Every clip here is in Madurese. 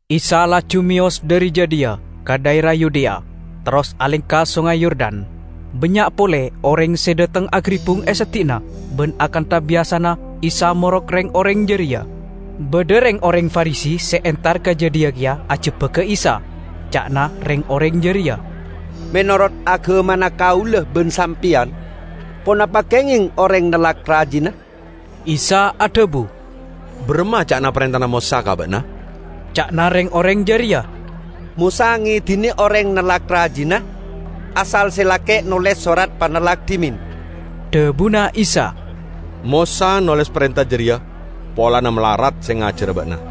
Isa laju meyos dhari jadhiya ka dhaera Yudea, terros alengka Songay Yordan. Bannya' pole oreng se dhateng agaribbung e seddi'anna, ban akantha biyasana Isa morok reng-oreng jareya. Badha reng-oreng Farisi se entar ka jadhiya keya ajebbaga Isa. Ca'na reng-oreng jareya, "Menorot agamana kaula ban sampeyan, ponapa kengeng oreng nellak rajina?" Isa adhabu, "Baramma ca'na parentana Mosa ka ba'na?" Ca'na reng-oreng jareya, "Mosa ngedine oreng nellak rajina, asal se lake' noles sorat panellak dhimen." Dhabuna Isa, "Mosa noles parenta jareya polana malarat se ngajara ba'na.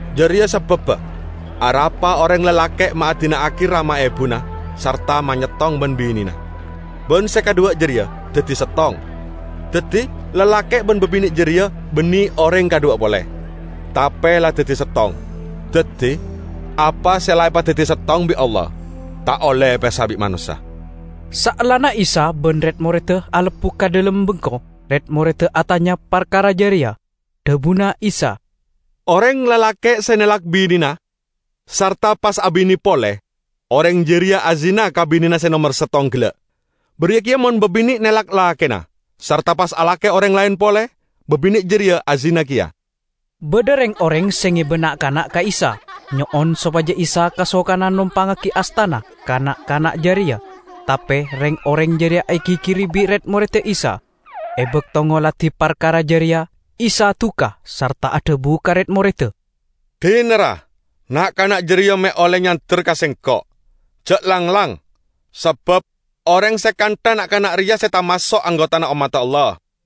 Jareya sababba arapa oreng lalake' ma' adina'agi rama ebuna sarta manyettong ban binena, ban se kadhuwa jareya daddi settong.' Daddi lalake' ban babine' jareya banne oreng kadhuwa pole, tape la daddi settong. Daddi, apa se la epadaddi settong bi' Allah, ta' olle epesa bi' manossa." Saellana Isa ban red-moredda alebbu ka dhalem bengko, red-moredda atanya parkara jareya. Dhabuna Isa, "Oreng lalake' se nellak binena sarta pas abine pole, oreng jareya azina ka binena se nomer settong gella'. Bariya keya mon babine' nellak lakena sarta pas alake oreng laen pole, babine' jareya azina keya." Badha reng-oreng se ngeba na'-kana' ka Isa, nyo'on sopaja Isa kasokana nompangngagi astana ka na'-kana' jareya, tape reng-oreng jareya egigiri bi' red-moredda Isa. E bakto ngoladi parkara jareya, Isa duka sarta adhabu ka red-moredda, "Dina, ra, na'-kana' jareya me' olle nyander ka Sengko'! Ja' langlang, sabab oreng se kantha na'-kana' reya se tamaso' anggotana ommadda Allah.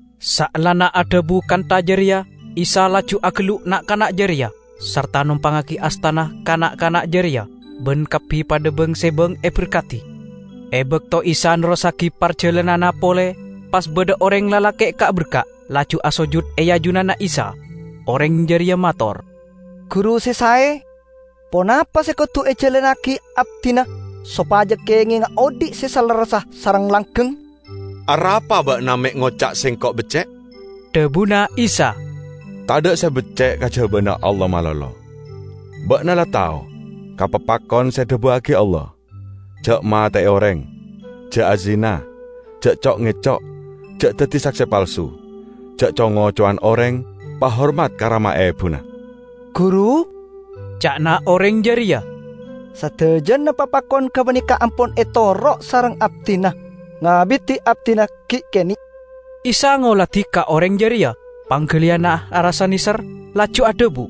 Saellana adhabu kantha jareya, Isa laju agellu' na'-kana' jareya, sarta nompangngagi astana ka na'-kana' jareya, ban kabbi padha bang-sebang eberkadi. E bakto Isa nerrossagi parjalananna pole, pas badha oreng lalake' ka'-berka', laju asojud e ajunanna Isa. Oreng jareya mator, "Guru se sae, ponapa se kodu ejalannagi abdina sopaja kengenga odhi' se salerressa sareng langgeng?" "Arapa ba'na me' ngoca' Sengko' becce'?" dhabuna Isa. "Tadha' se becce' kajabana Allah malolo. Ba'na la tao ka papakon se edhabuwagi Allah: 'Ja' mate'e oreng; ja' azina; ja' co'-ngeco'; ja' daddi sakse palsu; ja' co-ngocowan oreng; pahormat ka rama ebuna.' " "Guru," ca'na oreng jareya, "sadajana papakon gapaneka ampon etoro' sareng abdina ngabidi abdina gi' kene'." Isa ngoladi ka oreng jareya, panggaliyanna arassa neser, laju adhabu,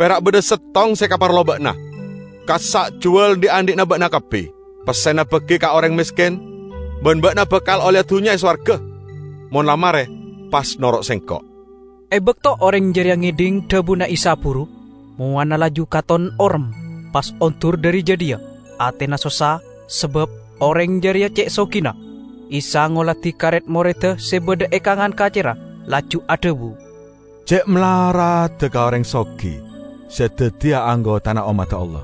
"Pera' badha settong se ekaparlo ba'na. Kassa' juwal dhi'-andhi'na ba'na kabbi, pessena bagi ka oreng mesken, ban ba'na bakal olleya dunnya e sowarga. Mon la mare pas noro' Sengko'." E bakto oreng jareya ngedhing dhabuna Isa buru, mowana laju katon orem, pas ondur dhari jadhiya, atena sossa sabab oreng jareya ce' sogina. Isa ngoladi ka red-moredda se badha e kangan kacerra, laju adhabu, "Ce' malaradda ka oreng sogi se daddiya anggotana ommadda Allah!"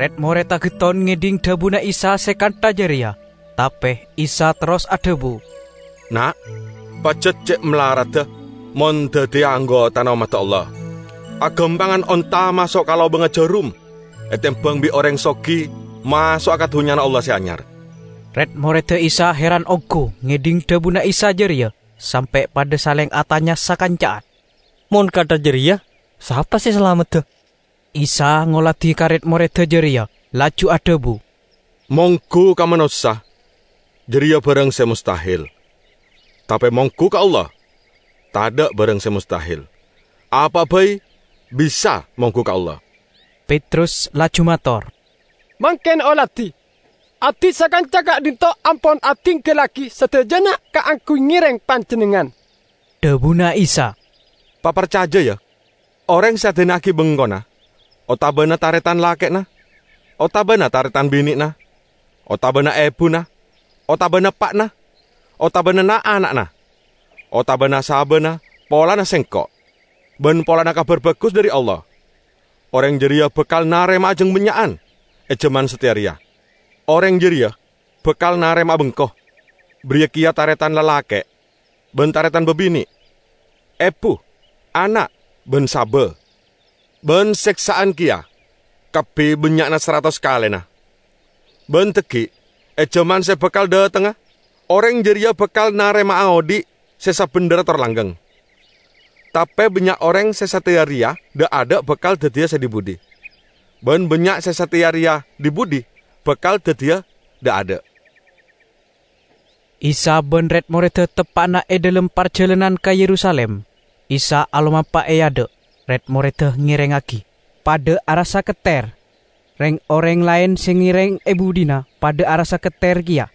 Red-moredda getton ngedhing dhabuna Isa se kantha jareya, tape Isa terros adhabu, "Na', pajat ce' malaradda mon daddiya anggotana ommadda Allah! Agampangan onta maso' ka lobangnga jarum etembang bi' oreng sogi maso'a ka Dunnyana Allah Se Anyar." Red-moredda Isa heran onggu ngedhing dhabuna Isa jareya, sampe' padha saleng atanya sakanca'an, "Mon kantha jareya sapa se salamedda?" Isa ngoladi ka red-moredda jareya, laju adhabu, "Monggu ka manossa jareya barang se mostahel, tape monggu ka Allah tadha' barang se mostahel; apa'a bai bisa monggu ka Allah." Petrus laju mator, "Mangken oladi, abdina sakanca ka'dhinto' ampon adinggallagi sadajana kaangguy ngereng Panjennengngan." Dhabuna Isa, "Paparcaja, ya: oreng se adina'agi bengkona, otabana taretan lake'na otabana taretan bine'na, otabana ebuna, otabana eppa'na, otabana na'-ana'na, otabana sabana polana Sengko' ban polana Kabar Bagus dhari Allah, oreng jareya bakal narema'a jang bannya'an e jaman sateya reya. Oreng jareya bakal narema'a bengko bariya keya taretan lalake' ban taretan babine', ebu, ana' ban saba, -- ban seksa'an keya, kabbi bannya'na saratos kalena. Ban dhaggi', e jaman se bakal dhatengnga, oreng jareya bakal narema'a odhi' se sabendherra tor langgeng. Tape bannya' oreng se sateya reya dha'-adha' bakal daddiya se dhi-budhi, ban bannya' se sateya reya dhi-budhi bakal daddiya dha'-adha'." Isa ban red-moredda teppa'na e dhalem parjalanan ka Yerusalim. Isa alomampa e adha', red-moredda ngerengngagi, padha arassa ketter. Reng-oreng laen se ngereng e budhina padha arassa ketter keya.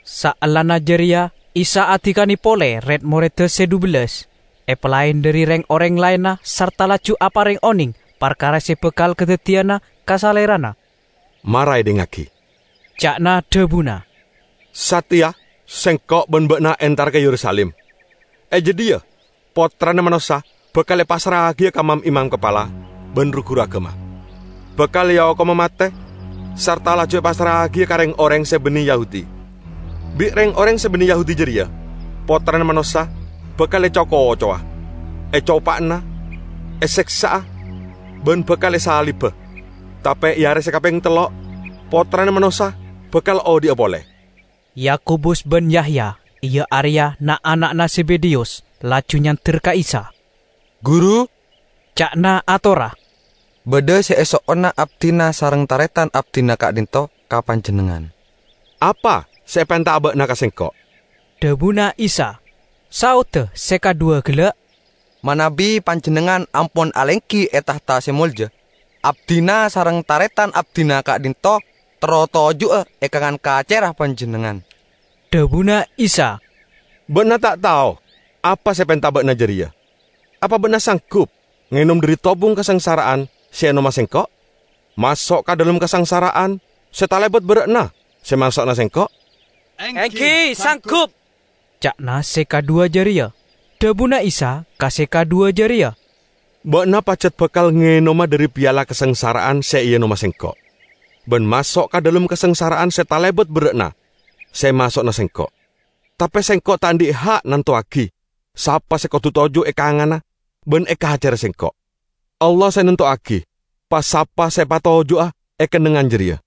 Saellana jareya Isa adikane pole red-moredda se dhubellas, epalaen dhari reng-oreng laenna sarta laju apareng oneng parkara se bakal kadaddiyana ka Salerana. "Mara edhingngagi," ca'na dhabuna, "sateya Sengko' ban ba'na entara ka Yerusalim. E jadhiya Pottrana Manossa bakal epassra'agiya ka mam-imam kapala ban ru-guru agama, bakal eokoma mate sarta laju epassra'agiya ka reng-oreng se banne Yahudi. Bi' reng-oreng se banne Yahudi jareya Pottrana Manossa bakal eco-kocowa, ecopa'ana, eseksa'a, ban bakal esaliba. Tape e are se kapeng tello' Pottrana Manossa bakal odhi'a pole." Yakobus ban Yahya, iya areya na'-ana'na Zebedeyus, laju nyander ka Isa. "Guru," ca'na atorra, "badha se eso'ona abdina sareng taretan abdina ka'dhinto' ka Panjennengngan." "Apa se epenta'a ba'na ka Sengko'?" dhabuna Isa. Saodda se kadhuwa gella', "Manabi Panjennengngan ampon alenggi e tahta se molja, abdina sareng taretan abdina ka'dhinto' terro toju'a e kangan kacerra Panjennengngan." Dhabuna Isa, "Ba'na ta' tao apa se epenta ba'na jareya. Apa ba'na sanggup ngenom dhari tobung kasangsara'an se eenoma Sengko', maso' ka dhalem kasangsara'an se talebat berra'na se emaso'ana Sengko'?" "Enggi, sanggup," ca'na se kadhuwa jareya. Dhabuna Isa ka se kadhuwa jareya, "Ba'na pajat bakal ngenoma dhari piala kasangsara'an se eenoma Sengko' ban maso' ka dhalem kasangsara'an se talebat berra'na se emaso'ana Sengko'. Tape Sengko' ta' andhi' ha' nantowagi sapa se kodu toju' e kanganna ban e kacerra Sengko'. Allah se nantowagi pa-sapa se epatoju'a e kennengngan jareya."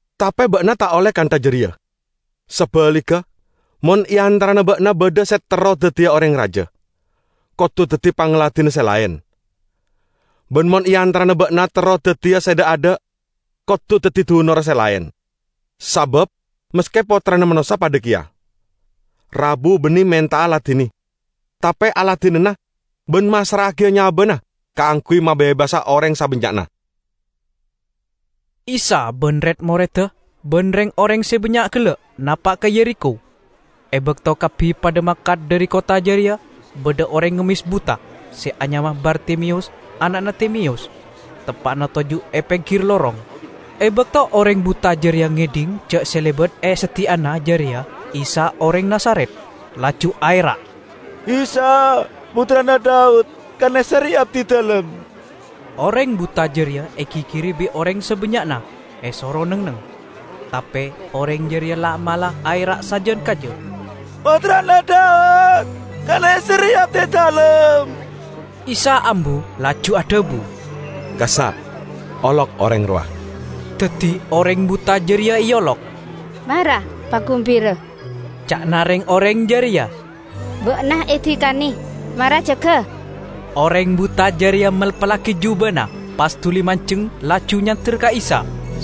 Tape ba'na ta' olle kantha jareya! Sabaligga, mon e antarana ba'na badha se terro daddiya oreng raja, kodu daddi pangladinna se laen. Ban mon e antarana ba'na terro daddiya se dha'-adha', kodu daddi dunorra se laen. Sabab maske Pottrana Manossa padha keya, rabu banne menta'a ladine, tape aladinana ban massra'agiya nyabana kaangguy mabebasa oreng sabannya'na." Isa ban red-moredda ban reng-oreng se bannya' gella' napa' ka Yerikho. E bakto kabbi padha mangkat dhari kottha jareya, badha oreng ngemmes buta se anyama Bartimeyus ana'na Timeyus teppa'na toju' e penggir lorong. E bakto oreng buta jareya ngedhing ja' se lebat e seddi'anna jareya Isa oreng Nazaret, laju aera', "Isa! Pottrana Daud! Kaneserre abdidalem!" Oreng buta jareya egigiri bi' oreng sabannya'na, esoro neng-enneng. Tape oreng jareya la'-mala' aera' sajan kaja, "Pottrana Daud, kaneserre abdidalem!" Isa ambu laju adhabu, "Kassa' olok oreng rowa!" Daddi oreng buta jareya eolok. "Mara neng-enneng," ca'na reng-oreng jareya. "Ba'na edikane, mara jaga!" Oreng buta jareya melpallagi jubana, pas duli manjeng laju nyander ka Isa.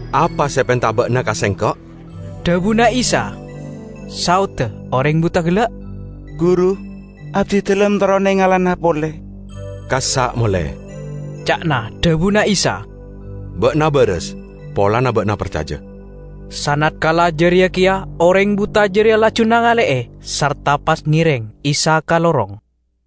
"Apa se epenta'a ba'na ka Sengko'?" dhabuna Isa. Saodda oreng buta gella', "Guru, abdidalem terro nengalana pole." "Kassa' mole," ca'na dhabuna Isa. "Ba'na baras polana ba'na parcaja." Sanatkala jareya keya oreng buta jareya laju nangale'e sarta pas ngereng Isa ka lorong.